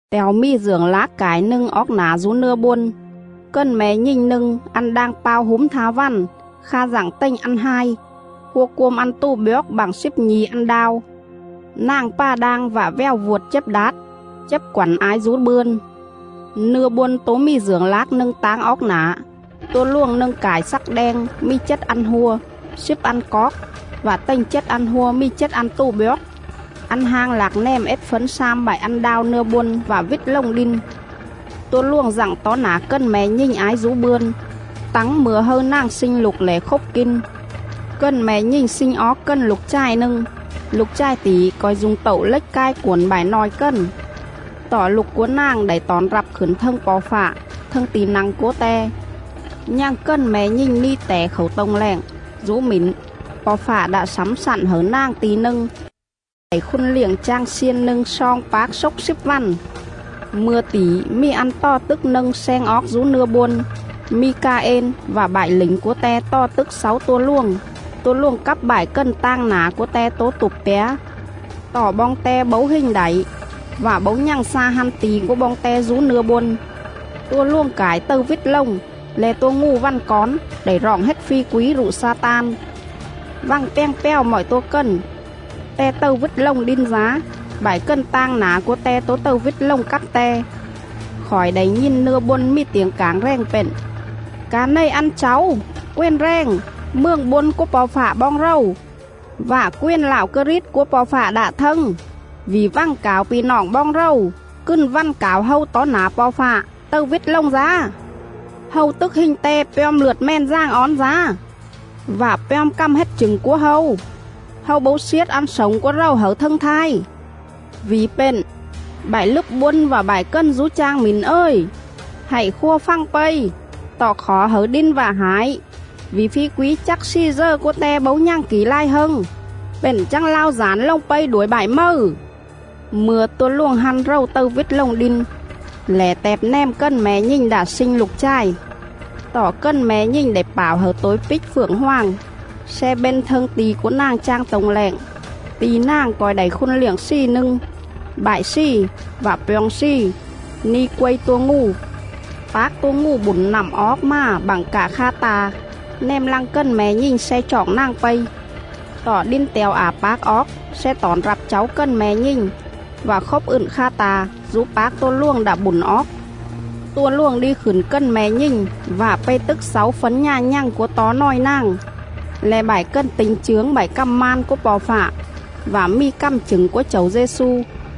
Te̱o mì dưởng lác cải nâng oóc nả dú nưa bôn: Cần me̱ nhình nâng ăn đang pao húm tha vằn, kha dặng tềnh ăn hai, hua cuôm ăn tù bjoóc bă̱ng slíp nhi̱ ăn đao. Nàng pà đang vạ vèo vuột chếp đát, chếp quẳn ái dú bươn. Nưa bôn tố mì dưởng lác nâng táng oóc nả: Tua luồng nâng cải slắc đeng mì chết ăn hua, slíp ăn coóc, vạ tềnh chết ăn hua mì chết ăn tù bjoóc.. Ăn hang lạc nèm ết fấn slam bại ăn đao nưa bôn vạ vít lồng đin. Tua luồng dặng tó nả cần me̱ nhình ái dú bươn, tắng mư̱a hâư nàng slinh lục lẻ khốp kin.. Cần me̱ nhình sling oóc cần lục chài nâng; lục chài tỉ co̱i du̱ng tậu lếch cai cuổn bại nòi cần. Tọ lục cúa nàng đảy tỏn rặp khửn thâng Po̱ Fạ, thâng ti̱ nă̱ng cúa Te.. Nhằng cần me̱ nhình ni tẻ khảu tô̱ng lẹng; dú mỉn, Po̱ Fạ đạ slẳm slặn hẩư nàng ti̱ nâng sle đảy khun liệng chang xiên nâng sloong pác xốc slíp vằn. Mư̱a tỉ mì ăn tò tức nâng sleng oóc dú nưa bôn: Mi-ca-ên vạ bại lỉnh cúa te tò tức xáu tua luồng; tua luồng cắp bại cần tang nả cúa te tố tụp pjá.. Tọ boong te bấu hình đảy, vạ bấu nhằng xa hăn ti̱ cúa boong te dú nưa bôn. Tua luồng cải tầư vít lồng, le̱ tua ngù vằn cón, đảy roọng hết phi quí rụ Xa-tan, vằng pjàng pjào mọi tua cần. Te tầư vít lồng đin dá; bại cần tang nả cúa te tố tầư vít lồng cắp te.. Khỏi đảy nhìn nưa bôn mì tiểng cảng rèng pện: “Ca này ăn cháu, quền rèng, Mường bôn cúa Po̱ Fạ boong rầu, Vạ quền Lạo Krit cúa Po̱ Fạ đạ thâng, Vỉ vằng cảo pi̱ noọng boong rầu, cừn vằn cảo hâu tó nả Po̱ Fạ, Tầư vít lồng dá.. Hâu tức hình te pjom lượt Mèn Dàng Ón dá, Vạ pjom cằm hết chửng cúa hâu; Hâu bấu sliết ăn slổng cúa rầu hẩư thâng thai. Vỉ pện, bại lứp bôn vạ bại cần dú chang mỉn ời, Hạy khua fằng pây! Tọ khỏ hẩư đin vạ hải, Vỉ phi quí chắc slì dờ cúa te bấu nhằng kỉ lai hâng, Pện chắng lao dản lồng pây đuổi bại mầư.” Mư̱a tua luồng hăn rầu tầư vít lồng đin, lẻ tẹp nèm cần me̱ nhình đạ sling lục chài. Tọ cần me̱ nhình đảy pảo hẩư tôi píc phượng hoàng sle bên thâng ti̱ cúa nàng chang tô̱ng lẹng, ti̱ nàng co̱i đảy khun liệng slì nâng, bại slì, vạ pjoo̱ng slì, ni quây tua ngù.. Pác tua ngù bủn nặm oóc mà bặng cạ kha ta̱ nèm lăng cần me̱ nhình sle choọng nàng pây. Tọ đin te̱o ả pác oóc sle tỏn rặp cháu cần me̱ nhình vạ khốp ựn kha ta̱ dú pác tua luồng đạ bủn oóc. Tua luồng đi khửn cần me̱ nhình vạ pây tức xáu fấn nhà nhằng cúa tó nòi nàng, le̱ bại cần ti̱nh chướng bại cằm man cúa Po̱ Fạ vạ mì cằm chửng cúa Chẩu Dê-xu.